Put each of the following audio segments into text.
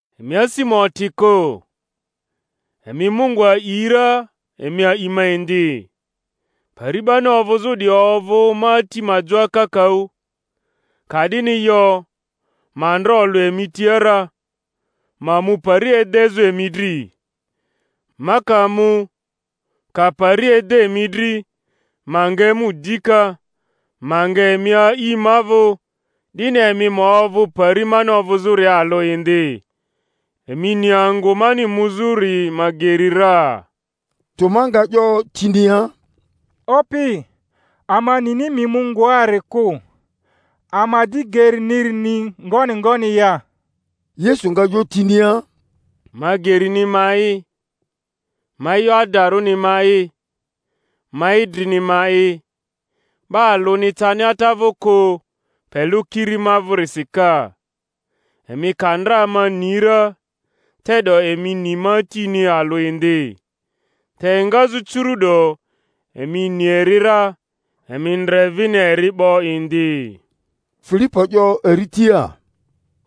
Emi asi ma oti kᴜ; emi Mungu a'i ra, emi a'i ma indi. Pari 'bani ovᴜzᴜ 'diyi ovᴜ ma Ati ma joa kakaᴜ; ka'dini yo, ma ndra olᴜ emi tia ra; ma mu pari edezᴜ emi dri. Ma ka mu, ka pari ede emi dri, ma nga emu dika, ma nga emi a'i ma vᴜ, 'dini emi ma ovᴜ pari mani ovᴜzᴜria alᴜ indi. Emi ni angᴜ mani muzᴜri ma geri ra. Toma nga 'yo tinia, Opi, ama nini mi mu ngoari kᴜ; ama di geriniri ni ngoni ngoni ya? Yesu nga 'yo tinia, Ma gerini ma'i, ma e'yo adarᴜni ma'i, ma idrini ma'i; 'ba alᴜni cani Ata vᴜ kᴜ, pe lᴜ kiri ma vᴜrisi ka. Emi ka ndra ma ni ra, te'do emi ni ma Atini alᴜ indi; te engazᴜ curu'do emi ni eri ra, emi ndre vini eri 'bo indi Filipo 'yo eri tia,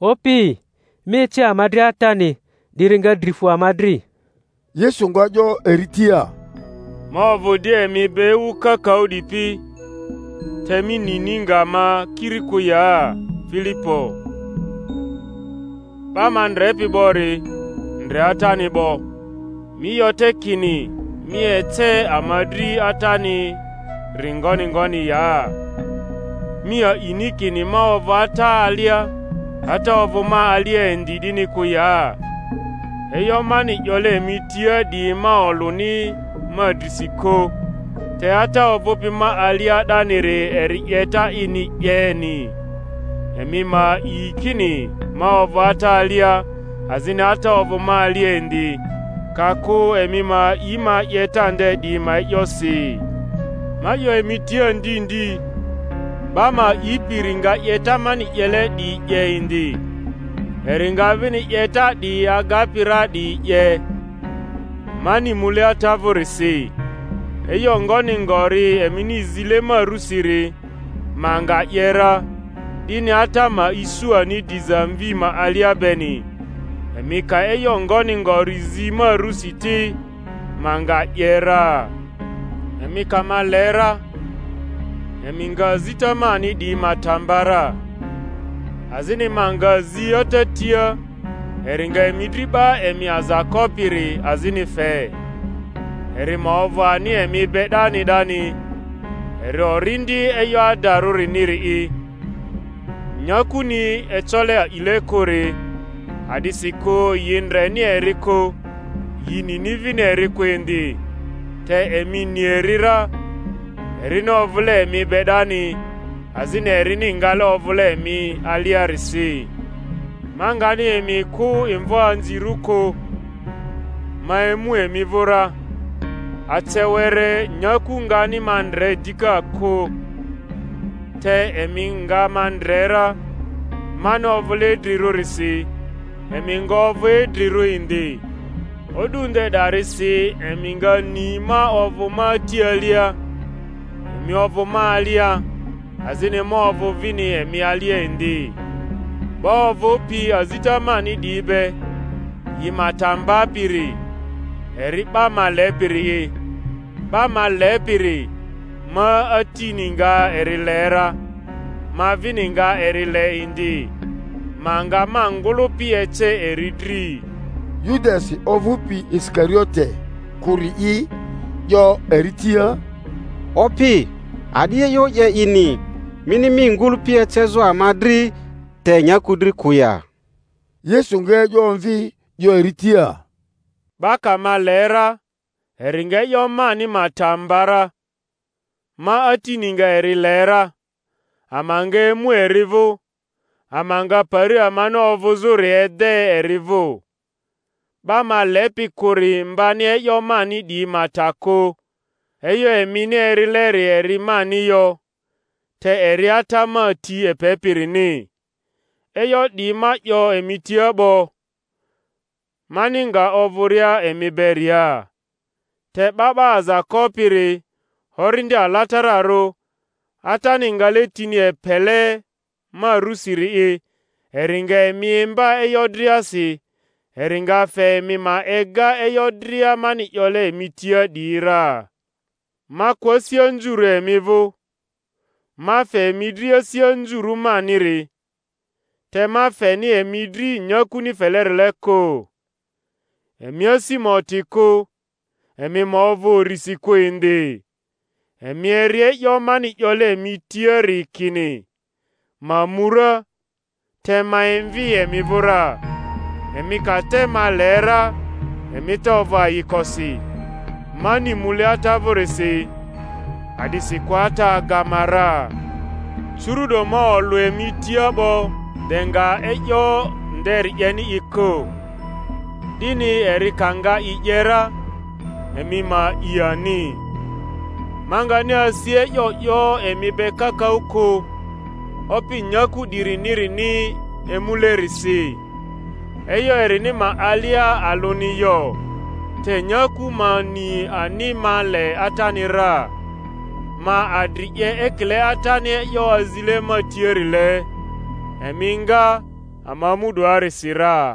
Opi, mi ece ama dri Atani, 'diri nga dri fu ama dri. Yesu nga 'yo eri tia, Ma ovᴜ di emi be ewu kakaᴜ 'dipi, te mi nini nga ma kiri kᴜ ya, Filipo? 'Ba ma ndrepi 'bori, ndre Atani 'bo; mi 'yo te kini, Mi ece ama dri Atani-ri ngoni ngoni ya? Mi a'ini kini ma ovᴜ Ata alia, Ata ovᴜ ma alia indi 'dini kᴜ ya? E'yo mani 'yole emi tia 'diyi ma olᴜni ma drisi kᴜ; te Ata ovᴜpi ma alia 'daniri eri 'yeta ini 'yeni Emi ma a'i kini ma ovᴜ Ata alia, azini Ata ovᴜ ma alia indi; ka kᴜ emi ma a'i ma 'yeta nde 'diyi ma e'yosi. Ma 'yo emi tia ndi ndi, 'ba ma a'ipiri nga 'yeta mani 'yele 'diyi 'ye indi; eri nga vini 'yeta 'diyi agapi ra 'diyi 'ye, mani mule Ata vᴜrisi. E'yo ngoni ngori emini zile ma rusiri, ma nga 'ye ra, 'dini Ata ma isu ani diza Mvi ma alia beni; emi ka e'yo ngoni ngori zi ma rusi ti, ma nga 'ye ra. Emi ka ma le ra, emi nga azita mani 'diyi ma ta mba ra. Azini ma nga zi Ata tia, eri nga emi dri 'Ba emi Aza Kopiri azini fe, eri ma ovᴜ ani emi be 'dani 'dani, eri Orindi e'yo adarᴜniri’i, nya-kuni ecole a'ile kᴜri, a'disikᴜ yi ndreni eri kᴜ, yi nini vini eri kᴜ indi; te emi ni eri ra, erini ovᴜle emi be 'dani, azini erini ngale ovᴜle emi aliarisi. Ma ngani emi kᴜ imvoanzirᴜ kᴜ; ma emu emi vᴜ ra. Ace were nyaku ngani ma ndre dika kᴜ, te emi nga ma ndre ra; mani ovᴜle idrirᴜrisi emi nga ovᴜ idrirᴜ indi. O'du nde 'darisi emi nga ni ma ovᴜ ma Ati alia, emi ovᴜ ma alia, azini ma ovᴜ vini emi alia indi. 'Ba ovᴜpi azita mani 'diyi be, yi ma ta mbapiri, eri 'ba ma lepiri'i; 'ba ma lepiri, ma Atini nga eri le ra, ma vini nga eri le indi, ma nga ma ngᴜlᴜpi ece eri dri. Yudasi (ovᴜpi Isikariote kᴜri'i) 'yo eri tia, Opi, a'di e'yo 'ye ini, mini mi ngᴜlᴜpi ecezᴜ ama dri te nyaku dri kᴜ ya? Yesu nga e'yo omvi, 'yo eri tia, Ba ka ma le ra, eri nga e'yo mani ma ta mba ra; ma Atini nga eri le ra, ama nga emu eri vᴜ, ama nga pari amani ovᴜzᴜri ede eri vᴜ. 'Ba ma lepi kᴜri mbani e'yo mani 'diyi ma ta kᴜ; e'yo emini erileri eri mani yo, te eri Ata ma ti epepirini. E'yo 'diyi ma 'yo emi tia 'bo, mani nga ovᴜria emi beria. Te 'Ba 'ba Aza Kopiri, Orindi Alatararᴜ, Atani ngale tini epele ma rusiri'i, eri nga emi imba e'yo driasi, eri nga fe emi ma ega e'yo dria mani 'yole emi tia 'diyi ra. Ma kᴜ asi anzurᴜ emi vᴜ; ma fe emi dri asi anzurᴜ maniri; te ma feni emi dri nyakuni felerile kᴜ. Emi asi ma oti kᴜ, emi ma ovᴜ urisi kᴜ indi. Emi eri e'yo mani 'yole emi tiari kini, Ma mu ra, te ma emvi emi vᴜ ra. Emi ka te ma le ra, emi te ovᴜ ayikosi, mani mule Ata vᴜrisi; a'disikᴜ Ata aga ma ra. Curu’do ma olᴜ emi tia 'bo de nga e'yo nderi 'yeni i kᴜ, 'dini eri ka nga i 'ye ra, emi ma a'i ani. Ma ngani asi e'yo 'yo emi be kakaᴜ kᴜ, opi nyaku 'dirinirini emulerisi. E'yo erini ma alia alᴜni yo; te nyaku ma ni ani ma le Atani ra, ma adri 'ye ekile Atani e'yo azile ma tiarile. Emi nga, ama mu 'doarisi ra.